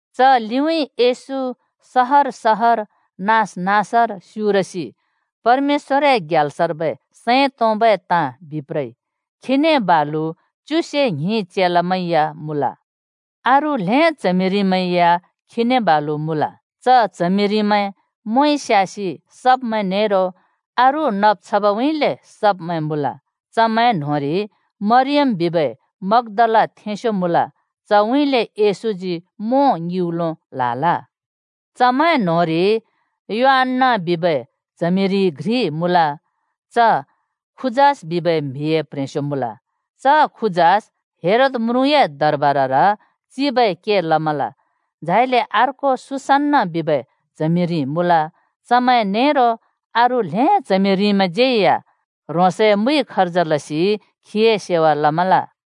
च लिउँइँ येशू सहर-सहर, नाँस-नाँसर स्‍युरसि परमेश्‍वरए ग्याल्सर्बै सैं तोंबै ताँ बिप्रइ। खीने बालु च्युसे ङ्हिं चेलामैं या मुँल। अरू ल्हें च्हमिरिमैं या खीने बालु मुँल। च च्हमिरिमैं मोंइ स्‍यासि सब्मैं नेरो अरू नब् छबउँइँले सब्मैं मुँल। चमैं न्होंरि मरियम बिबै मग्‍दालाथेंस्‍यो मुँल। चउँइँले येशूजी मों ङिउँलो ल्‍हाल। चमैं न्‍होंरि योअन्‍ना बिबै च्हमिरि घ्रि मुँल। च खुजास बिबै म्‍हिए प्ह्रेंस्यो मुँल। च खुजास हेरोद म्रुँए दरबारर चिबै के लमल। झाइले अर्को सुसन्‍ना बिबै च्हमिरि मुँल। चमैं नेरो अरू ल्‍हें च्हमिरिमैंज्‍यै या ह्रोंसए मुइ खर्ज लसि खीए सेवा लमल।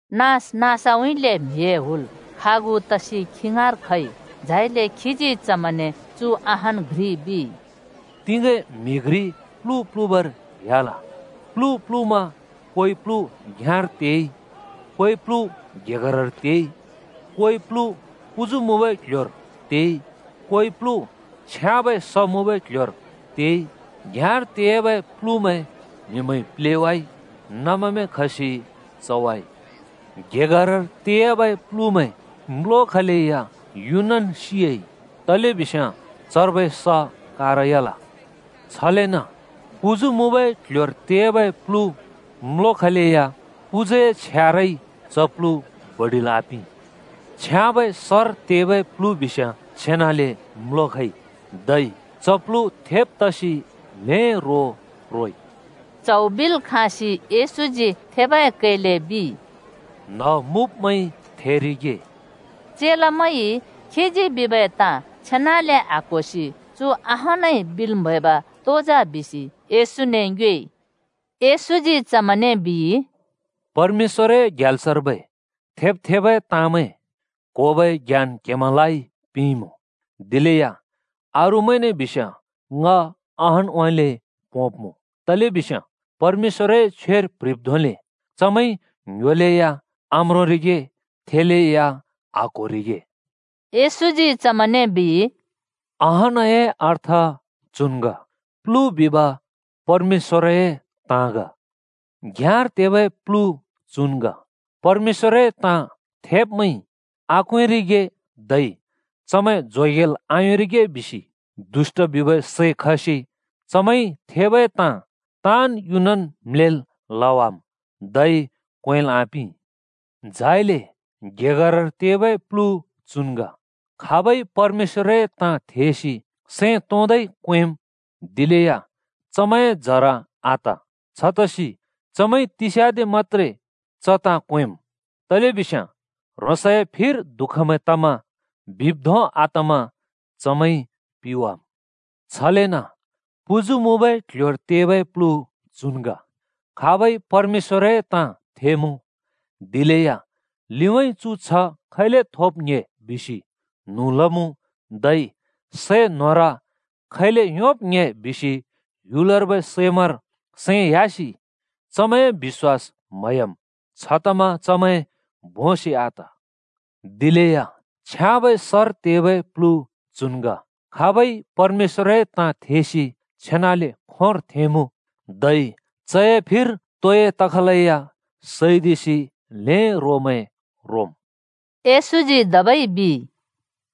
नाँस-नाँसउँइँले म्‍हिए हुल खागु तसि खी ङाँर खइ। झाइले खीजी चमैंने चु अहान् घ्रि बिइ। “तिगें म्‍हि घ्रि प्‍लु प्‍लुबर ह्‍याल। प्‍लु प्‍लुमा कोइ प्‍लु घ्‍याँर तेइ, कोइ प्‍लु गेगरर तेइ, कोइ प्‍लु पुजु मुँबै क्‍ल्‍ह्‍योर तेइ, कोइ प्‍लु छ्याँबै स मुँबै क्ल्ह्‍योर तेइ। घ्‍याँर तेयाबै प्‍लुमैं म्हिमैंइ प्‍लेवाइ, नमेमैं खसि चवाइ। गेगरर तेयाबै प्‍लुमैं म्‍लोखलेया युनन् सियाइ तलेबिस्याँ चर्बै स कारयाल। छलेन पुजु मुँबै क्‍ल्‍ह्‍योर तेयाबै प्लु म्‍लोखलेया पुजुए छ्यारइ च प्लु बडिल् आपिं। छ्याँबै सर तेबै प्‍लु बिस्याँ छेनले म्‍लोखइ। धै च प्‍लु थेब् तसि ल्‍हें रो रोइ।” च्हौ बिल् खाँसि येशूजी थेबै कैले बिइ, “थेबै न्ह मुँब्मैंइ थेरिगे।” चेलामैंइ खीजी बिबै ताँ छेनाले आक्होसि चु अहानइ बिल् म्हैब तो जा बिसि येशूने ङ्योएइ। येशूजी चमैंने बिइ, “परमेश्‍वरए ग्याल्सर्बै थेब् थेबै ताँमैं क्होबै ज्ञान क्हेमैंलाइ पिंइमुँ। दिलेया अरूमैंने बिस्याँ ङ अहानउँइँले पोंब्मुँ, तलेबिस्याँ परमेश्‍वरए छ्वेर प्‍ह्रिब् धोंले: ‘चमैंइ ङ्‌ह्‍योलेया आम्रोंरिगे, थेलेया आक्‍होरिगे।’” येशूजी चमैंने बिइ, “अहानए अर्थ चु ग: प्‍लु बिब परमेश्‍वरए ताँ ग। घ्‍याँर तेबै प्‍लु चुन् ग: परमेश्‍वरए ताँ थेब्मैंइ आक्वेंरिगे धै चमैं जोगेल् आयोंरिगे बिसि दुष्‍ट बिबै सै खसि चमैंइ थेबै ताँ ताँन् युनन् म्‍लेल् लवाम् धै क्वेंल् आपिं। झाइले गेगरर तेबै प्‍लु चुन् ग: खाबइ परमेश्‍वरए ताँ थेसि सैं तों-तोंइ क्‍वेंम्। दिलेया चमैंए जरा आत। छतसि चमैंइ तिस्याँदे मत्‍त्रे च ताँ क्वेंम्, तलेबिस्याँ ह्रोंसए फिर दुःखमैं तमा बिब् धों आतमा चमैंइ पिवाम्। छलेन पुजु मुँबै क्‍ल्‍ह्‍योर तेबै प्‍लु चुन् ग: खाबइ परमेश्‍वरए ताँ थेमुँ। दिलेया लिउँइँ चु छ्ह खैले थोब् ङ्‍हे बिसि न्‍हुँ लमुँ धै सम्‍पति खैले योंब् ङ्‍हे बिसि ह्‍युलर्बै सैमैंर सैं ह्‍यासि चमैंए बिश्‍वास म्‍हयाम्। छतमा चमैं भोंसि आत। दिलेया छ्याँबै सर तेबै प्‍लु चुन् ग: खाबइ परमेश्‍वरए ताँ थेसि छेनाले खोंर थेंमुँ। धै चए फिर तोइ तखलेया सैदिसि ल्हें रोमैं रोम्।” येशूजी धबै बिइ,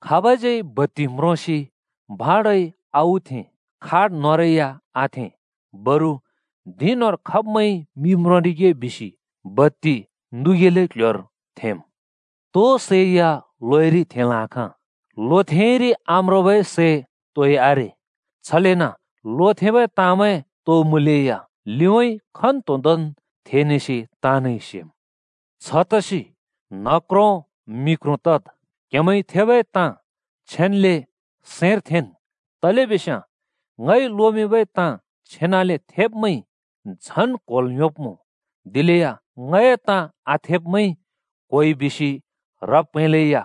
“खाब‍ज्यै बत्ति म्रोसि भाँडोइ आउथें, खाट न्होंरै या आथें। बरु धिं न्‍होंर खब्‍मैंइ मि म्रोंरिगे बिसि बत्ति नुबै क्‍ल्‍ह्‍योर थेंम्। तो सै या लोइरि थेंल् आँखाँ, लोथेंइरि आम्रोंबै सै तोइ आरे। छलेन लोथेंबै ताँमैं तो मुँलेया लिउँइँ खन्तोंदोंन् थेनेसि ताँनइ सेम्। “छतसि न्ह क्रों मि क्रों तद्, क्‍हेमैंइ थेबै ताँ छेन्‍ले सैंर थेंन्। तलेबिस्याँ ङइ लोमिंबै ताँ छेनाले थेब्मैंइ झन् क्होल् योंब्मुँ, दिलेया ङए ताँ आथेब्मैंइ क्होइ बिसि ह्रब् प्हैंलेया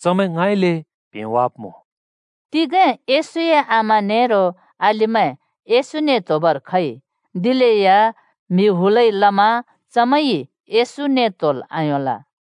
चमैं ङाँइँले प्हेंवाब्मुँ।” तिगें येशूए आमा नेरो अलिमैं येशूने त्‍होबर खइ। दिलेया म्‍हि हुलइ लमा चमैंइ येशूने त्‍होल् आयोंल।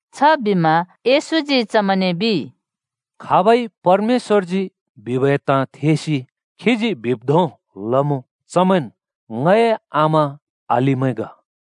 छबिमा येशूजी चमैंने बिइ, “खाबइ परमेश्‍वरजी बिबै ताँ थेसि खीजी बिब् धों लमुँ, चमैंन् ङए आमा अलिमैं ग।”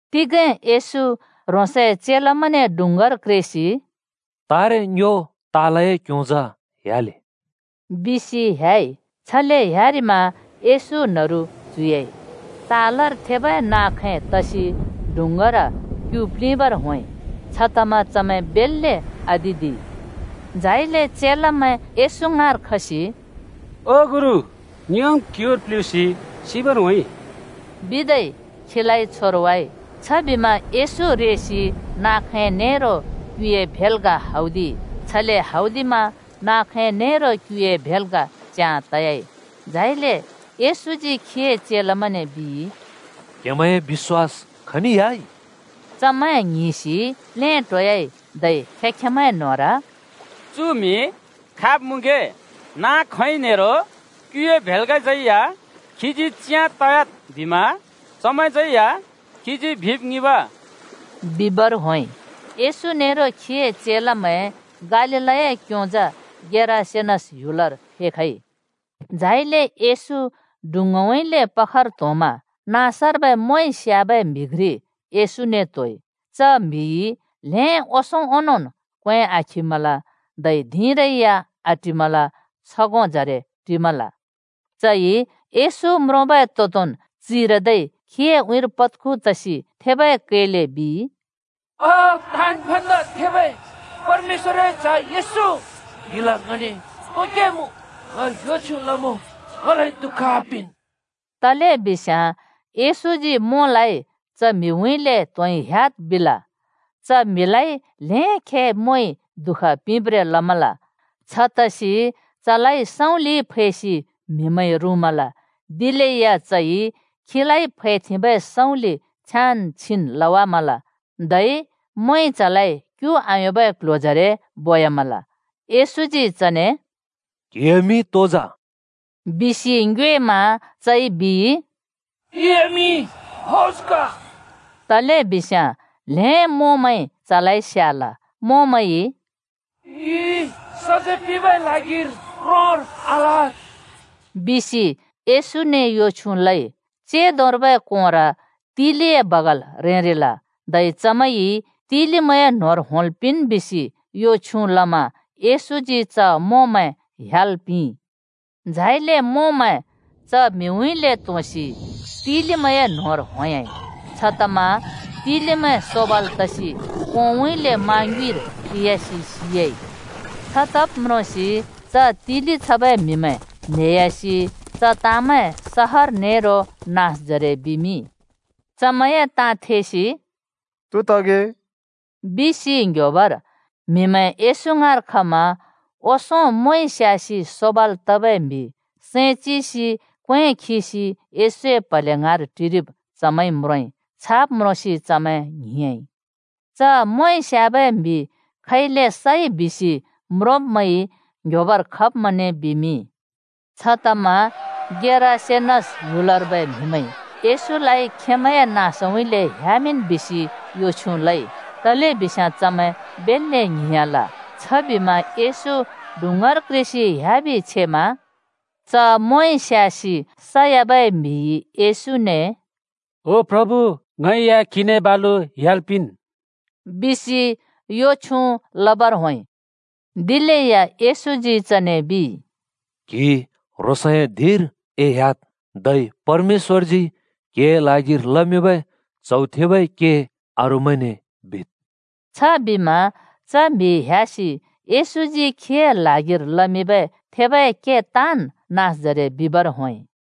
तिगें येशू ह्रोंसए चेलामैंने डुँङ्गार क्रेसि “तारे, ङ्यो तालए क्‍योंजा ह्‍याले ओ,” बिसि ह्‍याइ। छले ह्‍यारिमा येशू न्‍हरु च्‍हुयाइ। तालर थेबै नाँ खै खसि डुँङ्गार क्‍यु प्‍लिंबर होंइ। छतमा चमैं बेल्‍ले आतिदिइ। झाइले चेलामैं येशू ङाँर खसि “ओ गुरु, ङ्योम् क्युर प्ल्हुँसि सिबर होंइ,” बिदै खीलाइ छोरवाइ। छबिमा येशू रेसि नाँ खैं नेरो क्‍युए भेल्‍गा हौदिइ। छले हौदिमा नाँ खैं नेरो क्युए भेल्गा च्याँ तयाइ। झाइले येशूजी खीए चेलामैंने बिइ, “क्‍हेमैंए बिश्‍वास खनि ह्‍याइ?” चमैं ङ्हिंसि प्लेटोयाइ धै खें-खेंमैं न्होंर “चु म्हि खाब् मुँगे? नाँ खैं नेरो क्युए भेल्गालाज्यै या खीजी च्याँ तयाद् बिमा चमैंज्यै या खीजी बिब ङिंब!” बिबर होंइ। येशू नेरो खीए चेलामैं गालीलए क्योंजा गेरासेनस ह्‍युलर फेखइ। झाइले येशू डुँङ्गाउँइँले पखर त्‍होंमा मोंइ स्‍याबै नाँसर्बै म्‍हि घ्रि येशूने त्‍होइ। च म्‍हिइ ल्हें ओंसों ओंनोंन् क्‍वें आखिमल धै धिंरै या आटिमल छगोंजरे टिमल। चइ येशू म्रोंबै तोदोंन् चिरदै खीए उँइँर पद्खु तसि थेबै कैले बिइ, “ओ ताँन् भन्दा थेबै परमेश्‍वरए च्‍ह येशू, क्‍हिल ङने तो के मुँ? यो छ्युँ लमुँ, ङलाइ दुःख आपिंन्।” तलेबिस्याँ येशूजी च म्हिउँइँले मों त्होंइ ह्‍याद् बिल। च म्हिलाइ ल्हें खे मोंइ दुःख पिंब्ब्रें लमाल। छतसि चलाइ सँउँलिइ फैसि म्हिमैंइ रुँमल। दिलेया चइ खीलाइ फैथेंबै सँउँलि छ्याँन् छिन् लवामल। धै मोंइ चलाइ क्यु आयोंबै क्ल्ह्‍योजरे बोयामल। येशूजी चने “क्‍हिए मिं तो जा?” बिसि ङ्योएमा चइ बिइ, “ङए मिं फौज ग।” तलेबिस्याँ ल्हें मोंमैंइ चलाइ स्याल। “ङि सजैं पिंबै ल्हागिर क्रोंर आल्हाद्,” बिसि मोंमैंइ येशूने यो छ्युँ लइ। चेंदोर्बै कोंर तिलिए बगाल रेंरिल। धै चमैंइ तिलिमैंए न्होंर होंल् पिंन् बिसि यो छ्युँ लमा येशूजी च मोंमैं ह्‍याल् पिंइ। झाइले मोंमैं च म्‍हिउँइँले त्‍होंसि तिलिमैंए न्होंर ‍होंयाइ। छतमा तिलिमैं सोबाल तसि कोंउँइँले मा ङ्युँइर ते‍यासि सियाइ। छ तब् म्रोंसि च तिलि छबै म्‍हिमैं न्हेयासि च ताँमैं सहर नेरो नाँसजरे बिमिंइ। चमैंए ताँ थेसि “तो तगे” बिसि ङ्‌ह्‍योबर म्हिमैं येशू ङाँर खमा ओंसों मोंइ स्‍यासि सोबल् तबै म्‍हि सैं चिसि क्‍वें खिसि येशूए प्‍हले ङाँर टिरिब चमैंइ म्रोंइ। छाब् म्रोंसि चमैं ङ्हिंयाँइ। च मोंइ स्याबै म्हि खैले सइ बिसि म्रोंब्मैंइ ङ्ह्‍योएबर खब्मैंने बिमिंइ। छतमा गेरासेनस ह्‍युलर्बै म्‍हिमैंइ येशूलाइ खेंमैंए नाँसउँइँले ह्‍यामिंन् बिसि यो छ्युँ लइ, तलेबिस्याँ चमैं बेल्‍ले ङ्हिंयाँल। छबिमा येशू डुँङ्गार क्रेसि ह्‍याबि छेमा। मोंइ स्यासि सयाबै च म्‍हिइ येशूने “ओ प्रभु ङै या क्‍हिने बालु ह्‍याल् पिंन् बिसि यो छ्युँ लबर होंइ।” दिलेया येशूजी चने बिइ, “क्हि ह्रोंसए धिंर एह्‍याद्, धै परमेश्‍वरजी क्‍हिए ल्हागिर लमिंबै च्हौ थबै के अरूमैंने बिद्।” छबिमा च म्‍हि ह्‍यासि येशूजी खीए ल्हागिर लमिंबै थेबै के ताँन् नाँसजरे बिबर होंइ।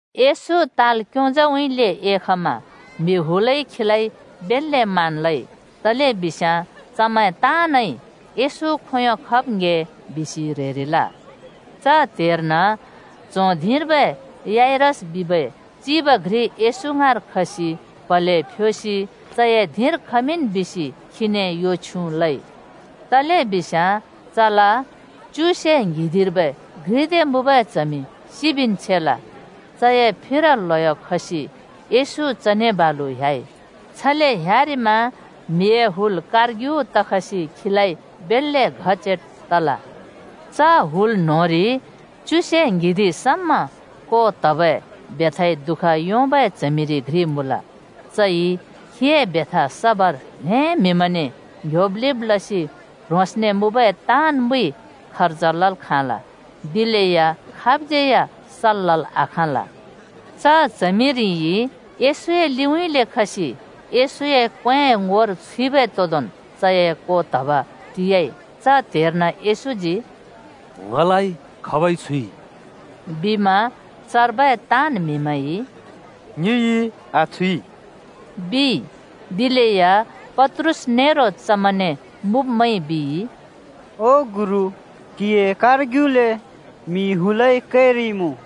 येशू ताल क्योंज‍उँइँले एखमा म्‍हि हुलइ खीलाइ बेल्‍ले मान लइ, तलेबिस्याँ चमैं ताँनइ येशू खोंयों खब् ङ्‍हे बिसि ह्रेरिल। च त्हेर्न च्हों धिंर्बै याइरस बिबै चिब घ्रि येशू ङाँर खसि प्‍हले फ्‍योसि चए धिंर खमिंन् बिसि खीने यो छ्युँ लइ। तलेबिस्याँ चल च्युसे ङ्हिंदिंर्बै घ्रिदे मुँबै च्हमि सिबिन् छेल। चए फिर ल्हयो खसि येशू चने बालु ह्‍याइ। छले ह्‍यारिमा म्हिए हुल कारर्ग्यु तखसि खीलाइ बेल्‍ले घच्याट तल। च हुल न्‍होंरि च्युसे ङ्हिंदिं समा को त्हबै बेथाइ दुःख योंबै च्हमिरि घ्रि मुँल। चइ खीए बेथा सबर ल्‍हें म्‍हिमैंने ङ्‍ह्‍योब्-लिब् लसि ह्रोंसने मुँबै ताँन् मुइ खर्ज लल् खाँल। दिलेया खाबज्यै या सल् लल् आखाँल। च च्हमिरिइ येशूए लिउँइँले खसि येशूए क्‍वेंए ङोर छुइबै तोदोंन् चए को त्हब टि‍याइ। च त्हेर्न येशूजी “ङलाइ खाबइ छुइ?” बिमा चर्बै ताँन् म्हिमैंइ “ङिइ आछुइ,” बिइ। दिलेया पत्रुस नेरो चमैंने मुँब्मैंइ बिइ, “ओ गुरु, क्‍हिए कारर्ग्युले म्हिए हुल घचेट तरिइमुँ!”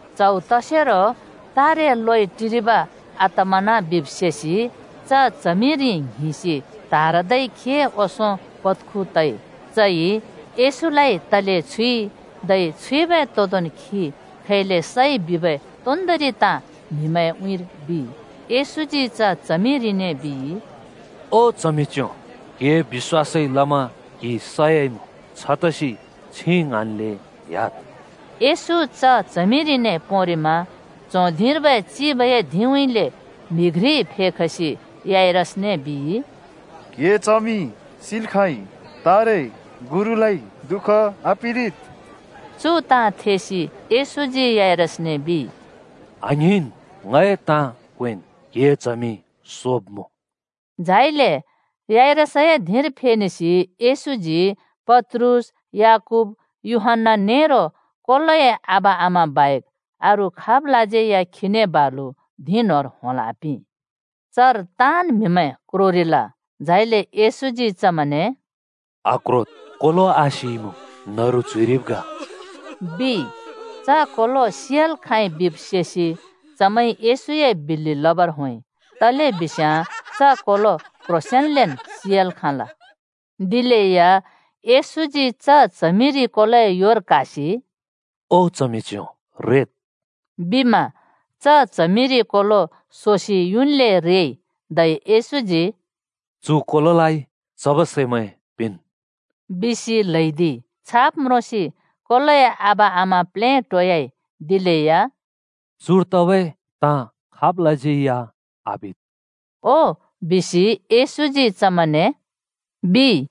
च्हौ तसेरो तारे लोइ टिरिब आतमना बिब् सेसि च च्हमिरि ङ्हिंसि त्हारदै खीए ओंसों पत्खु तइ। चइ येशूलाइ तले छुइ, धै छुइबै तोदोंन् खी खैले सइ बिबै तोन्दोंरि ताँ म्‍हिमैंए उँइँर बिइ। येशूजी च च्हमिरिने बिइ, “ओ च्हमिच्‍यों, क्‍हिए बिश्‍वासइ लमा क्हि सयाइमुँ, छतसि छिं ङ्हाँन्ले ह्‍याद्।” येशू च च्हमिरिने पोंरिमा च्हों धिंर्बै चिबए धिंउँइँले म्‍हि घ्रि खसि याइरसने बिइ, “क्‍हिए च्हमि सि‍ल् खाँइ। तारे गुरुलाइ दुःख आपिंरिद्।” चु ताँ थेसि येशूजी याइरसने बिइ, “आङ्हिंन्! ङए ताँ क्वेंन्! क्‍हिए च्हमि सोब्‍मुँ।” झाइले याइरसए धिंर फेनेसि येशूजी पत्रुस, याकूब, यूहन्‍ना नेरो च्हमिरि कोलोए आबा-आमा बाहेक अरू खाबलाज्यै या खीने बालु धिं न्‍होंर होंल् आपिं। चर ताँन् म्‍हिमैं क्रोरिल। झाइले येशूजी चमैंने “आक्रोद्, कोलो आसिइमुँ, न्‍हरु च्‍हुइरिब् ग,” बिइ। च कोलो सियाल् खाँइ बिब् सेसि चमैंइ येशूए बिल्‍लि लबर होंइ। तलेबिस्याँ च कोलो क्ह्रोंसेंनन् सियाल् खाँल। दिलेया येशूजी च च्हमिरि कोलोए योर क्‍हासि “ओ च्हमिच्‍यों रेद्,” बिमा च च्हमिरि कोलो सोसि युन्ले रेइ। धै येशूजी “चु कोलोलाइ चबै सैमैं पिंन्” बिसि ल्हैदिइ। छाब् म्रोंसि कोलोए आबा-आमा प्लेटोयाइ। दिलेया “चुर तबै ताँ खाबलाज्यै या आबिद् ओ बिसि येशूजी चमैंने,” बिइ।